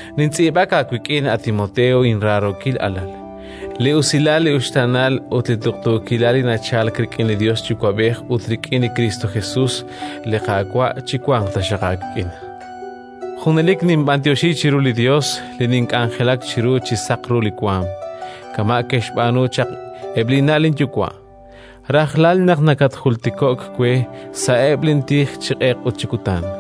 nintz'iib'ak aawik'in, a Timoteo inraarookil alal. Li usilal, li uxtaanal ut li tuqtuukilal li nachalk rik'in li Yos Yuwa'b'ej ut rik'in li Kristo Jesus, li Qaawa', chiwanq taxaq aawik'in. Junelik ninb'anyoxi chiru li Yos li nink'anjelak chiru chi saq ru li waanm, kama' ke'xb'aanu chaq eb' linna' linyuwa', rajlal naq nakatjultiko'k we sa'eb' lintij chi q'eq ut chi kutan.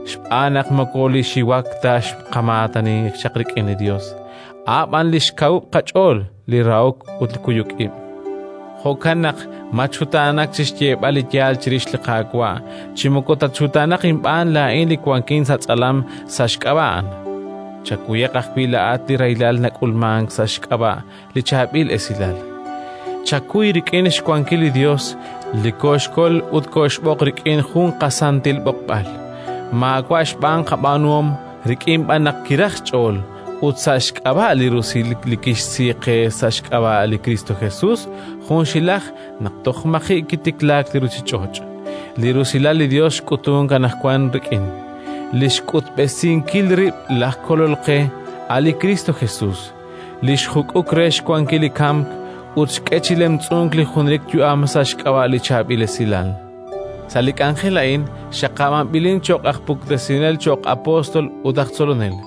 Xb'aan naq moko li xiwak ta xqamaatani chaq rik'in li Yos, a' b'an li xkawub' qach'ool, li rahok ut kuyuk ib'. Jo'kan naq matxutaanak chi xyeeb'al li yaal chirix li Qaawa', chi moko tatxutaanaq inb'aan laa'in li wankin sa' tz'alam sa' xk'ab'a' A'an. Chakuyaq ajwi' laa'at li rahilal nak'ulmank sa' xk'ab'a' li Chaab'il Esilal. Chakuy rik'in xwankil li Yos li kooxkol ut kooxb'oq rik'in jun qasantil b'oqb'al, maawa' xb'aan qab'aanuhom, rik'in b'an naq kiraj xch'ool ut sa' xk'ab'a' li rusilal li kixsi qe sa' xk'ab'a' li Kristo Jesus junxilaj naq toj maji' kitiklaak li ruuchich'och'. Li rusilal li Yos xk'utunk anaqwan rik'in li xk'utb'esinkil rib' laj Kolol qe, a' li Kristo Jesus, li xjuk'uk re xwankil li kamk ut xk'e chi lemtz'unk li junelik yu'am sa' xk'ab'a' li Chaab'il Esilal. Sa' li k'anjel a'in xaqab'anb'ilin cho'q aj puktesinel, cho'q apóstol ut aj tzolonel,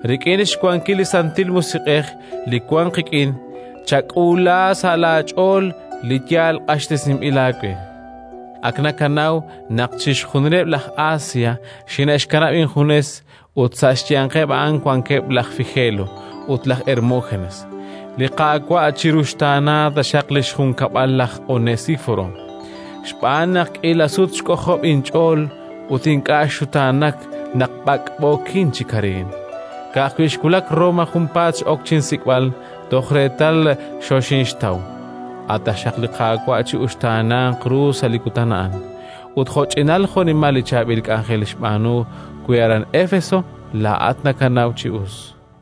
Rik'in xwankil li Santil Musiq'ej li wank qik'in chak'uula sa' laach'ool li yaal q'axtesinb'il aawe. Ak nakanaw naq chixjunileb' laj Asia xine'xkanab' injunes, ut sa' xyanqeb' a'an wankeb' laj Figelo ut laj Hermógenes. Li Qaawa' chiruxtaana taxaq li xjunkab'al laj Onesíforo, xb'aan naq k'iila sut xk'ojob' inch'ool ut ink'a' xxutaanak naq b'ak'b'ookin chi kareen. Ka'ajwi' xwulak Roma, junpaat x'ok chinsik'b'al toj reetal xoxinxtaw. A' taxaq li Qaawa' chi'uxtaananq ru sa' li Kutan a'an, ut jo'ch'inal jo'nimal li chaab'il k'anjel xb'aanu we aran Éfeso, laa'at nakanaw chi us.